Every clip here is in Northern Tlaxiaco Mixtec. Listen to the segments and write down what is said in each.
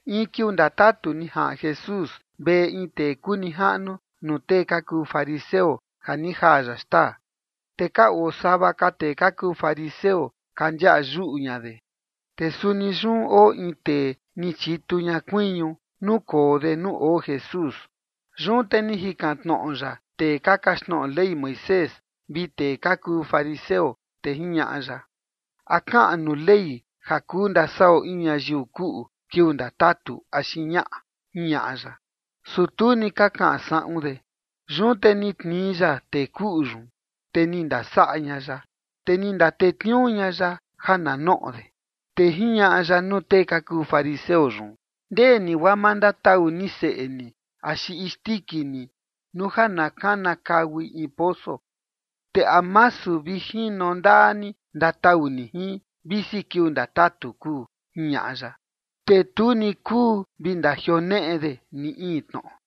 In kiuu ndatatu ni jaꞌan Jesús veꞌe in tee kuu nijaꞌnu nuu tee ka kuu fariseo, ja ni jaa ya xtaa. Te ka oo sava ka tee ka kuu fariseo ka ndiaꞌa yuꞌu ña de. Te suni yun oo in tee ni chitu ña kuiñu nukoo de nuu oo Jesús. Yun te ni jikan tnoꞌo ya tee ka kaxtnoꞌo Ley Moisés vi tee ka kuu fariseo, te jiñaꞌa ya: ―¿A kaꞌan nuu Ley ja kuu ndasaꞌo in ñayiu kuꞌu kiuu ndatatu, axi ñaꞌa? ―jiñaꞌa ya. Su tu ni ka kaꞌan saꞌun de. Yun te ni tnii ya tee kuꞌu yun, te ni ndasaꞌa ña ya, te ni ndatetniuu ña ya ja na noꞌo de. Te jiñaꞌa ya nuu tee ka kuu fariseo yun: ―Ndee ni guaa ma ndatau ni seꞌe ni axi isndiki ni nuu ja na kanakaui in poso, ¿te a masu vi jino ndaa ni ndatau ni jin, visi kiuu ndatatu kuu? ―jiñaꞌa ya. Te tu ni kuu vi ndajioneꞌe de ni in tnoꞌo.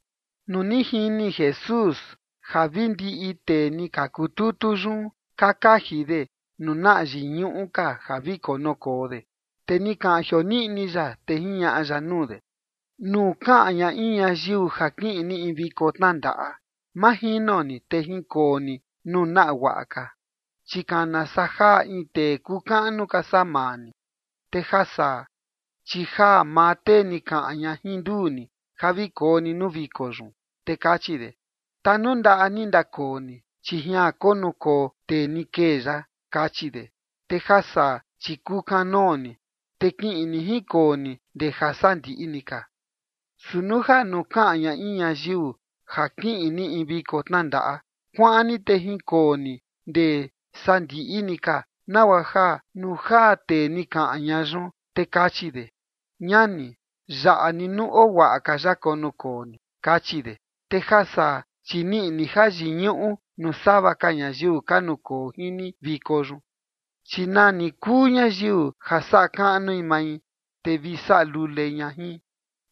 Nuu ni jini Jesús ja vi ndiꞌi tee ni ka kututu yun ka kaji de nuu naꞌa yiñuꞌu ka ja vi konukoo de, te ni kaꞌan jioniꞌni ya, te jiñaꞌa ya nuu de: ―Nuu kaꞌan ña in ñayiu ja kiꞌin ni in viko tnandaꞌa, ma jino ni te jinkoo ni nuu naꞌa guaꞌa ka, chi kana saa jaa in tee kuu kaꞌnu ka saa maa ni. Te ja saa, chi jaa maa tee ni kaꞌan ña jin nduu ni ja vi koo ni nuu viko yun, te kachi de: “Tanundaꞌa ni ndakoo ni, chi jian konukoo tee ni kee yaꞌa”, kachi de. Te ja saa, chi kukanoo ni, te kiꞌin ni jinkoo ni ndee jasandiꞌi ni ka. Su nuu ja nuu kaꞌan ña in ñayiu ja kiꞌin ni in viko tnandaꞌa, kuaꞌan ni te jinkoo ni ndee sandiꞌi ni ka, nagua ja nuu jaa tee ni kaꞌan ña yun, te kachi de: “Ñani, yaꞌa ni nuu oo guaꞌa ka yaꞌa konukoo ni”, kachi de. Te ja saa, chi niꞌi ni ja yiñuꞌu nuu sava ka ñayiu ka nukoo jin ni viko yun. Chi nani kuu ñayiu ja saꞌa kaꞌnui mai, te vi saꞌa lule ña jin.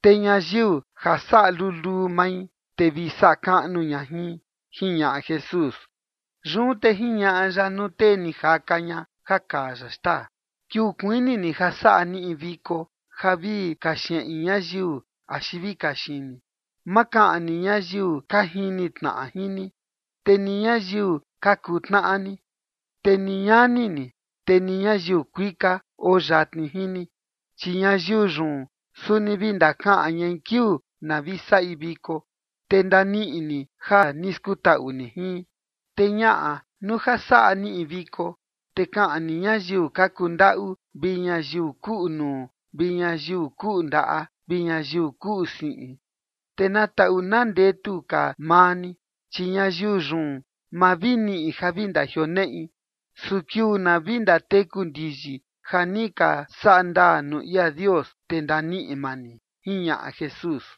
Te ñayiu ja saꞌa luluu mai, te vi saꞌa kaꞌnu ña jin ―jiñaꞌa Jesús. Yun te jiñaꞌa ya nuu tee ni jaka ña ja kaa ya xtaa: ―Kiuu kuini ni ja saꞌa ni in viko ja vi kaxeꞌin ñayiu axi vi kaxini, ma kaꞌan ni ñayiu ka jini tnaꞌa jin ni, te ni ñayiu ka kuu tnaꞌa ni, te ni ñani ni, te ni ñayiu kuika oo yatni jin ni, chi ñayiu yun suni vi ndakaꞌan ñai kiuu na vi saꞌi viko, te ndaniꞌi ni ja ni skutaꞌu ni jin. Te ñaꞌa, nuu ja saꞌa ni in viko, te kaꞌan ni ñayiu ka kundaꞌu, vi ñayiu kuꞌu nuu, vi ñayiu kuꞌu ndaꞌa, vi ñayiu kuꞌu siꞌin. Te na taꞌu na ndetu ka maa ni, chi ñayiu yun ma vi niꞌi ja vi ndajioneꞌi. Su kiuu na vi ndateku ndiyi ja ni ka saꞌa ndaa nuu ia Dios, te ndaniꞌi maa ni ―jiñaꞌa Jesús.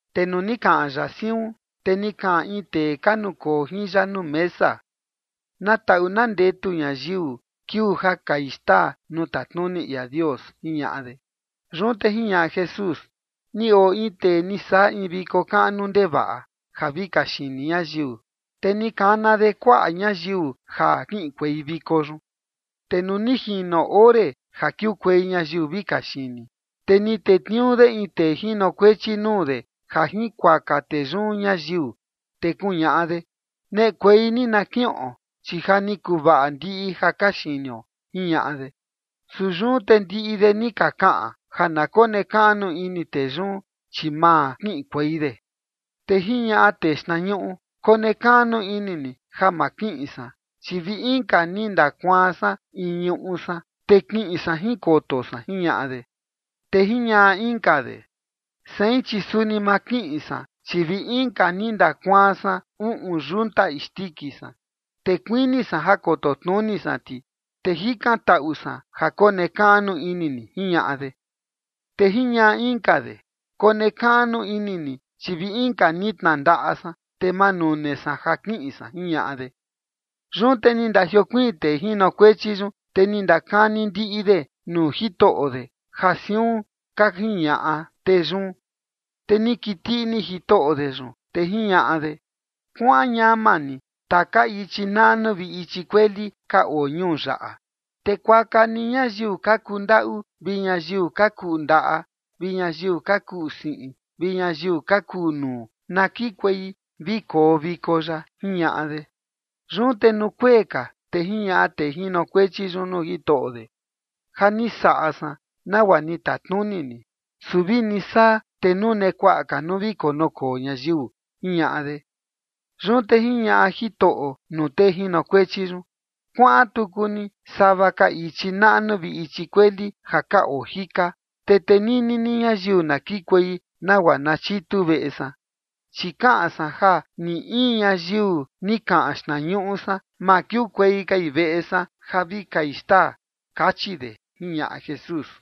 Te nuu ni kaꞌan ya siun, te ni kaꞌan in tee ka nukoo jin ya nuu mesa: ―¡Na taꞌu na ndetu ñayiu kiuu ja kai xtaa nuu tatnuni ia Dios! ―jiñaꞌa de. Yun te jiñaꞌa Jesús: ―Ni oo in tee ni saꞌa in viko kaꞌnu ndevaꞌa ja vi kaxini ñayiu, te ni kana de kuaꞌa ñayiu ja kiꞌinkuei viko yun. Te nuu ni jino ore ja kiukuei ñayiu vi kaxini, te ni tetniuu de in tee jinokuechi nuu de ja jinkuaka tee yun ñayiu, te kuñaꞌa de: “Neꞌekuei ni na kiꞌon, chi ja ni kuvaꞌa ndiꞌi ja kaxinio”, jiñaꞌa de. Su yun te ndiꞌi de ni ka kaꞌan ja na konekaꞌnu ini tee yun, chi ma kiꞌinkuei de. Te jiñaꞌa tee xtnañuꞌu: “Konekaꞌnu ini ni ja ma kiꞌin san, chi vi inka ni ndakuaan san in ñuꞌu san, te kiꞌin san jinkoto san”, jiñaꞌa de. Te jiñaꞌa inka de: “Sein, chi suni ma kiꞌin san, chi vi inka ni ndakuaan san uꞌun yunta isndiki san, te kuini san ja koto tnuni san ti, te jikantaꞌu san ja konekaꞌnu ini ni”, jiñaꞌa de. Te jiñaꞌa inka de: “Konekaꞌnu ini ni, chi vi inka ni tnandaꞌa san, te ma nune san ja kiꞌin san”, jiñaꞌa de. ’Yun te ni ndajiokuiin tee jinokuechi yun, te ni ndakani ndiꞌi de nuu jitoꞌo de ja siun ka jiñaꞌa tee yun. Te ni kiti ini jitoꞌo de yun, te jiñaꞌa de: “Kuaꞌan ñama ni taka ichi naꞌnu vi ichi kueli ka oo ñuu yaꞌa, te kuaka ni ñayiu ka kundaꞌu, vi ñayiu ka kuꞌu ndaꞌa, vi ñayiu ka kuꞌu siꞌin, vi ñayiu ka kuꞌu nuu, na kikuei vi koo viko yaꞌa”, jiñaꞌa de. Yun te nuu kuee ka, te jiñaꞌa tee jinokuechi yun nuu jitoꞌo de: “Ja ni saꞌa san nagua ni tatnuni ni, su vini saa, te nune kuaꞌa ka nuu vi konukoo ñayiu”, jiñaꞌa de. Yun te jiñaꞌa jitoꞌo nuu tee jinokuechi yun: “Kuaꞌan tuku ni sava ka ichi naꞌnu vi ichi kueli ja ka oo jika, te tenini ni ñayiu na kikuei nagua na chitu veꞌe san. Chi kaꞌan san ja ni in ñayiu ni kaꞌan xtnañuꞌu san, ma kiukuei kai veꞌe san ja vi kai xtaa”, kachi de ―jiñaꞌa Jesús.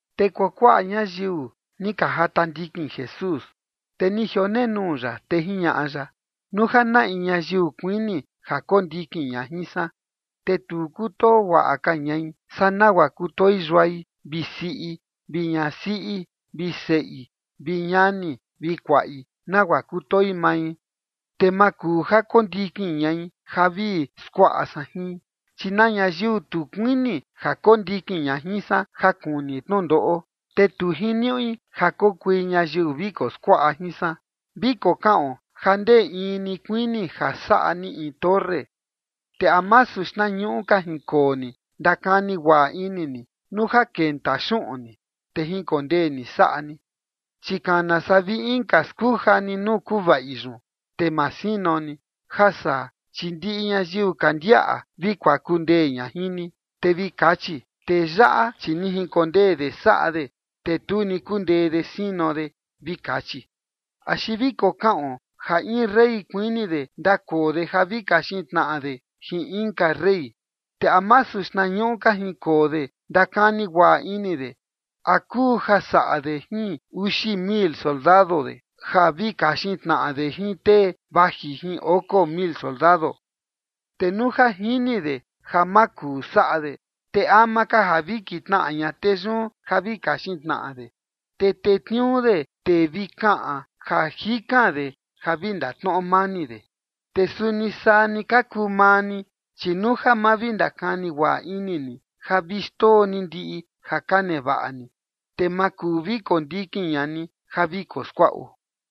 Te kuakuaꞌa ñayiu ni ka jata ndikin Jesús, te ni jionenuu ya, te jiñaꞌa ya: ―Nuu ja na in ñayiu kuini ja kondikin ña jin san, te tu kutoo guaꞌa ka ñai saa nagua kutoi yuai vi siꞌi, vi ñasiꞌi vi seꞌi, vi ñani vi kuaꞌi, vi nagua kutoi mai, te ma kuu ja kondikin ñai ja vi skuaꞌa san jin. Chi na ñayiu tu kuini ja kondikin ña jin san ja kuni tnundoꞌo, te tu jiniuꞌi ja kokui ñayiu vi koskuaꞌa jin san. ’Vi kokaꞌon ja ndee in ni kuini ja saꞌa ni in torre, te ¿a masu xtnañuꞌu ka jinkoo ni ndakani guaꞌa ini ni nuu ja kenta xuꞌun ni, te jinkondee ni saꞌa ni? Chi kana saa vi inka skuja ni nuu kavai yun, te ma sino ni, ja saa, chi ndiꞌi ñayiu ka ndiaꞌa vi kuaku ndee ña jin ni. Te vi kachi: “Tee yaꞌa, chi ni jinkondee de saꞌa de, te tu ni kundee de sino de”, vi kachi. ’Axi vi kokaꞌon ja in rey kuini de ndakoo de ja vi kaxin tnaꞌa de jin inka rey, te ¿a masu xtnañuꞌu ka jinkoo de ndakani guaꞌa ini de a kuu ja saꞌa de jin uxi mil soldado de, ja vi kaxin tnaꞌa de jin tee vaji jin oko mil soldado? Te nuu ja jini de ja ma kuu saꞌa de, te ama ka ja vi kitnaꞌa ña tee yun ja vi kaxin tnaꞌa de, te tetniuu de tee vi kaꞌan ja jikan de ja vi ndatnoꞌo mani de. Te suni saa ni ka kuu maa ni, chi nuu ja ma vi ndakani guaꞌa ini ni ja vi xndoo ni ndiꞌi ja ka nevaꞌa ni, te ma kuu vi kondikin ña ni ja vi koskuaꞌo.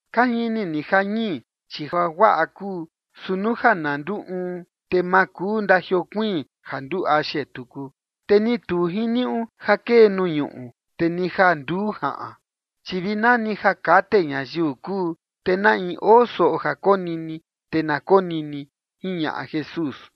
’Ka jini ni ja ñii, chi ja guaꞌa kuu, su nuu ja na nduu uun, te ma kuu ndajiokuiin ja nduu axe tuku. Te ni tu jiniuꞌu ja kee nuu ñuꞌu, te ni ja nduu jaꞌan, chi vi nani ja kate ñayiu kuu. Te na in oo soꞌo ja konini, te na konini ―jiñaꞌa Jesús.